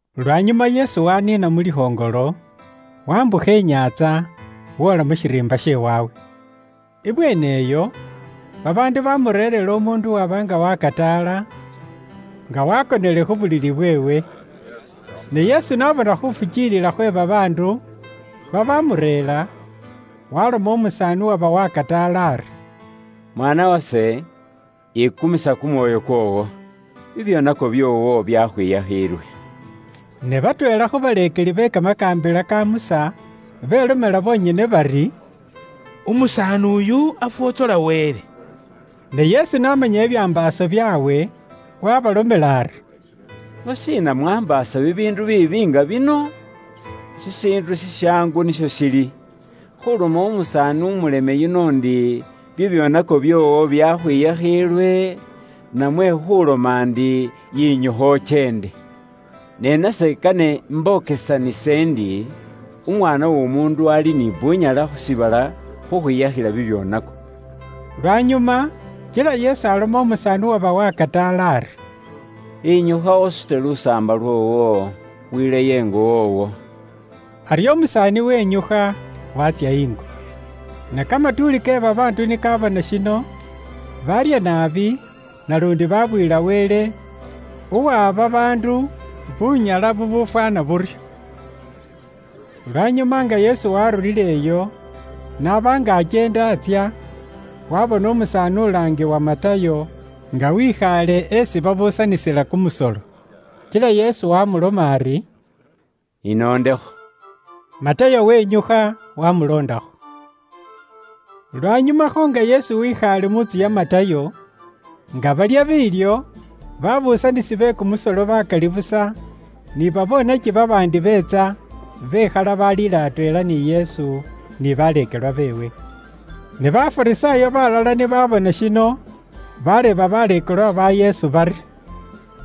Lwanyuma Yesu waniina mu likhoŋolo, wambukha inyaantsa, woola mu shiriimba she waabwe. Ibweene iyo babaandu baamureerera umuundu uwaba nga wakataala, nga waakonele khu bulili bweewe. Ne Yesu n'abona khuufukiilila khwe babaandu babaamureera, waalomela umusaani uwaba wakataala ari, “Mwaana wase, yikumisa kumwoyo kwoowo. Bibyoonako byoowo byakhwiyakhiilwe.” Ne batweela khu baleekeli be kamakaambila ka Musa belomela bonyene bari, “Umusaani uyu afwotsola Wele.” Ne Yesu n'amanya bibyambaaso byaabwe, wabareeba ari, “Lwashiina mwaambaasa bibiindu biibi nga bino mu myoyo kyeenywe? Shishiindu shishaangu nisho shili; khuuloma umusaani umuleme yuno ndi, ‘Bibyoonako byoowo byakhwiyakhiilwe,’ namwe khuuloma ndi, ‘Yinyukha ukyeende?’ Ne nase kane imbokesanise indi Umwaana w'Omuundu ali ni bunyala khu shiibala khukhwiyakhila bibyoonako.” Lwanyuma kila Yesu aloma umusaani uwaba wakataala ari, “Yinyukha usute lusaamba lwoowo, wileyo ingo woowo.” Aryo umusaani wenyukha, waatsya ingo. Ne kamatuuli ke babaandu ni kaabona shino, baarya naabi, naluundi baabuyila Wele uwaha babaandu bunyala bubuufwaana buryo. Lwanyuma nga Yesu waarulileyo, n'aba nga akyeenda atsya, waabona umusaani ulaangiwa Matayo nga wekhaale esi babuusanisila kumusolo. Kila Yesu waamuloma ari, “Inoondekho.” Matayo wenyukha waamuloondakho. Lwanyumakho nga Yesu wekhaale mu ntsu ya Matayo, nga balya biilyo, babuusanisi be kumusolo bakali busa, ni babonaki babaandi beetsa bekhala baliila atweela ni Yesu, ni baleekelwa beewe. Ne Bafarisaayo balala ni baabona shino, baareeba baleekelwa ba Yesu bari,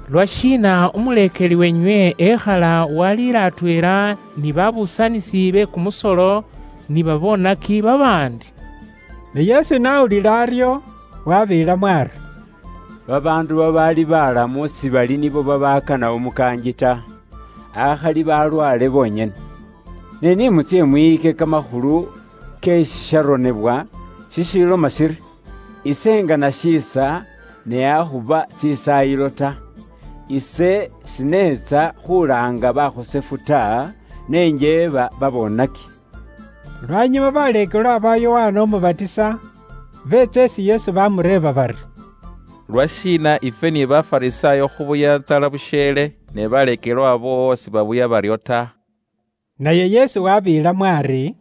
“Lwashiina umuleekeli weenywe ekhala waaliila atweela ni babuusanisi be kumusolo ni baboonaki babaandi?” Ne Yesu n'awulila aryo, wabeelamo ari, “Babaandu babaali baalamu sibali nibo babaakana umukaangi ta, akhali balwaale bonyene. Ne ni mutsye mwiyike kamakhulu ke shisharonebwa shishiloma shiri, ‘Ise ingana shiisa, ne akhuba tsisaayilo ta.’ Ise shineetsa khulaanga bakhosefu ta, ne njeeba babonaki.” Lwanyuma baleekelwa ba Yokana Umubatisa beetsa isi Yesu baamureeba bari, “Lwashiina ifwe ni Bafarisaayo khubuya intsala busheele, ne baleekelwa boowo sibabuya baryo ta?” Naye Yesu wabeelamo ari,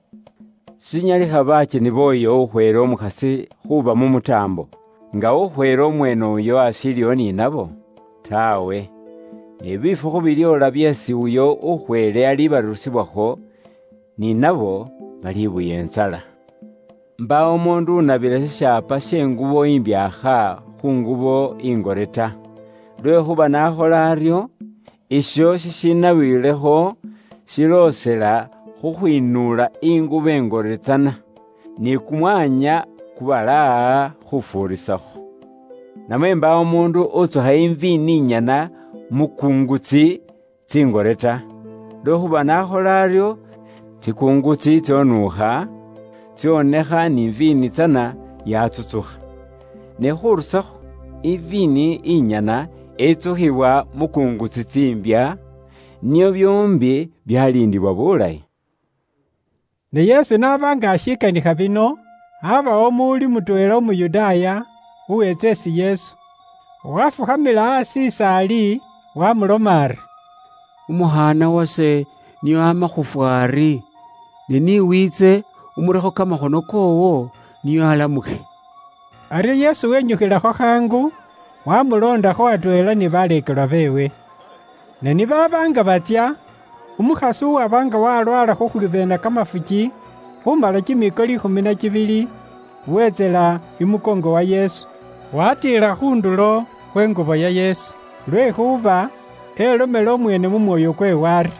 “Shinyalikha bakyeni booyo ukhweele umukhasi khuuba mu mutaambo, nga ukhweele mweene uyo ashiiliwo ni nabo? Taawe! Ne bifukhu bilyoola byeesi uyo ukhweele aliibarusibwakho, ni nabo balibuya intsala. “Mbaawo umuundu unabila shishaapa she ngubo imbyaakha khu ngubo ingore ta. Lwekhuuba n'akhola aryo, isho shishinabiwilekho shiloosela khukhwinuula ingubo ingore tsana, ni kumwanya kubalaaha khufuuriisakho. Namwe mbaawo umuundu utsukha iviini inyana mu kungutsi tsingore ta. Lwekhuuba n'akhola aryo, tsikungutsi tsonuukha, tsonekha ni iviini tsana yatsutsukha. Ne khurusakho, iviini inyana itsukhiwa mu kungutsi tsiimbya, nio byoombi byaliindiwa bulayi.” Ne Yesu n'aba nga ashikanikha bino, aabawo umuwuli mutweela Umuyudaaya, uweetsa isi Yesu, waafukhamila aasi is'ali, waamuloma ari, “Umukhaana wase nio aama khuufwa ari, ne ni wiitse, umurekho kamakhono koowo nio alamukhe.” Aryo Yesu wenyukhilakho khaangukho, waamuloondakho, atweela ni baleekelwa beewe. Ne ni baaba nga batsya, umukhasi uwaba nga walwaala khukhwibeena kamafuki khuumala kimiiko liikhumi na kibili, wetsila imukoongo wa Yesu, waatiila khu ndulo khwe ngubo ya Yesu. Lwekhuuba elomela umweene mu mwoyo kweewe ari,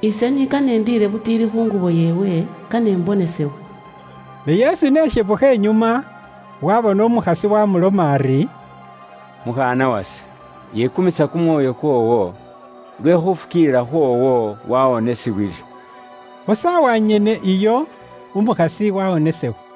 “Ise ni kane indiile butiili khu ngubo yeewe, kane imbonesebwe.” Ne Yesu n'eshebukha inyuma, waabona umukhasi waamuloma ari, “Mukhaana wase, yikumisa kumwoyo kwoowo, lwe khuufukiilila khwoowo waawonisibwile.” Khu saawa nyene iyo, umukhasi waawonesebwa.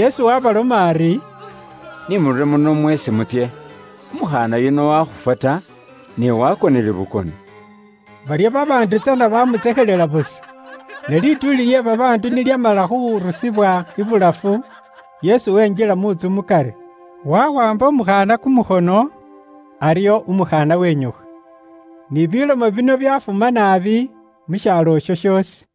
Yesu waabaloma ari, “Ni murure muno mweesi mutsye, umukhaana yuno wakhufwa ta, ne waakonele bukoni.” Baryo babaandu tsana baamutsekhelela busa. Ne lituuli lye babaandu ni lyamala khurusibwa ibulafu, Yesu wenjila mu ntsu mukari, wawaamba umukhaana kumukhono, aryo umukhaana wenyukha. Ni bilomo bino byafuma naabi mu shaalo isho shoosi.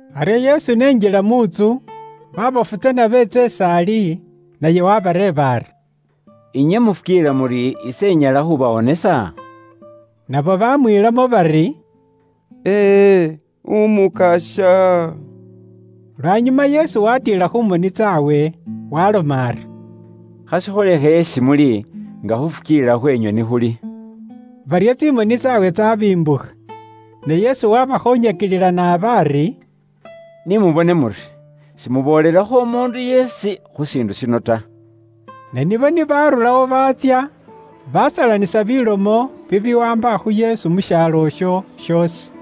Aryo Yesu n'enjila mu ntsu, baabofu tsana beetsa is'ali, naye waabareeba ari, “Inywe mufukiilila muri ise inyala khuubawonesa?” Nabo baamwiilamo bari, “Ee, Umukasya.” Lwanyuma Yesu waatiila khu moni tsaabwe, waaloma ari, “Khashikholekhe isi muli nga khuufukiilila khweenywe ni khuli.” Baryo tsimoni tsaabwe tsaabimbukha. Ne Yesu waabakhoonyakilila naabi ari, “Ni mubone muri, simuboolelakho umuundu yeesi khu shiindu shino ta.” Ne nibo ni baarurawo baatsya, baasalanisa bilomo bibiwaamba khu Yesu mu shaalo isho shoosi.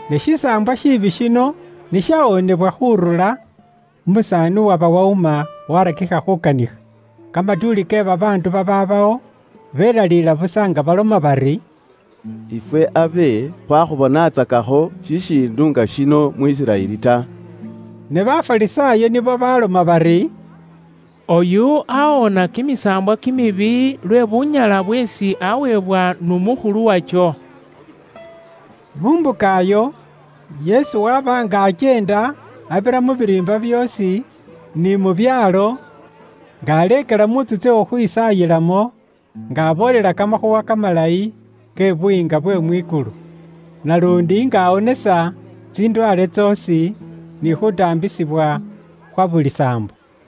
Ne shisaambwa shiibi shino ni shawoonebwa khurura, umusaani uwaba wawuma waarakikha khuukanikha. Kamatuuli ke babaandu babaabawo belaliila busa nga baloma bari, “Ifwe abe khwakhubonatsakakho shishiindu nga shino mu Isiraeli ta.” Ne Bafarisaayo nibo baloma bari, “Oyu awoona kimisaambwa kimibi lwe bunyala bweesi aweebwa n'umukhulu wakyo.” Mu mbuka iyo, Yesu waaba nga akyeenda abira mu biriimba byoosi, ni mu byaalo, nga aleekelela mu ntsu tsye khukhwisaayilamo, nga aboolela kamakhuuwa kamalayi ke Buyiinga bwe mwikulu, naluundi nga awonesa tsindwaale tsoosi, ni khuutaambisibwa khwa buli saambo.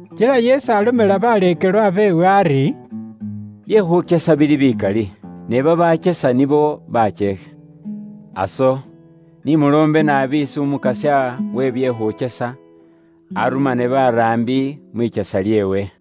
Kila Yesu alomela baleekelwa beewe ari, “Bye khuukyesa bili bikali, ne babakyesa nibo bakyeekhe. Aso, ni muloombe naabi isi Umukasya we bye khukyesa, arumane baraambi mwikyesa lyeewe.”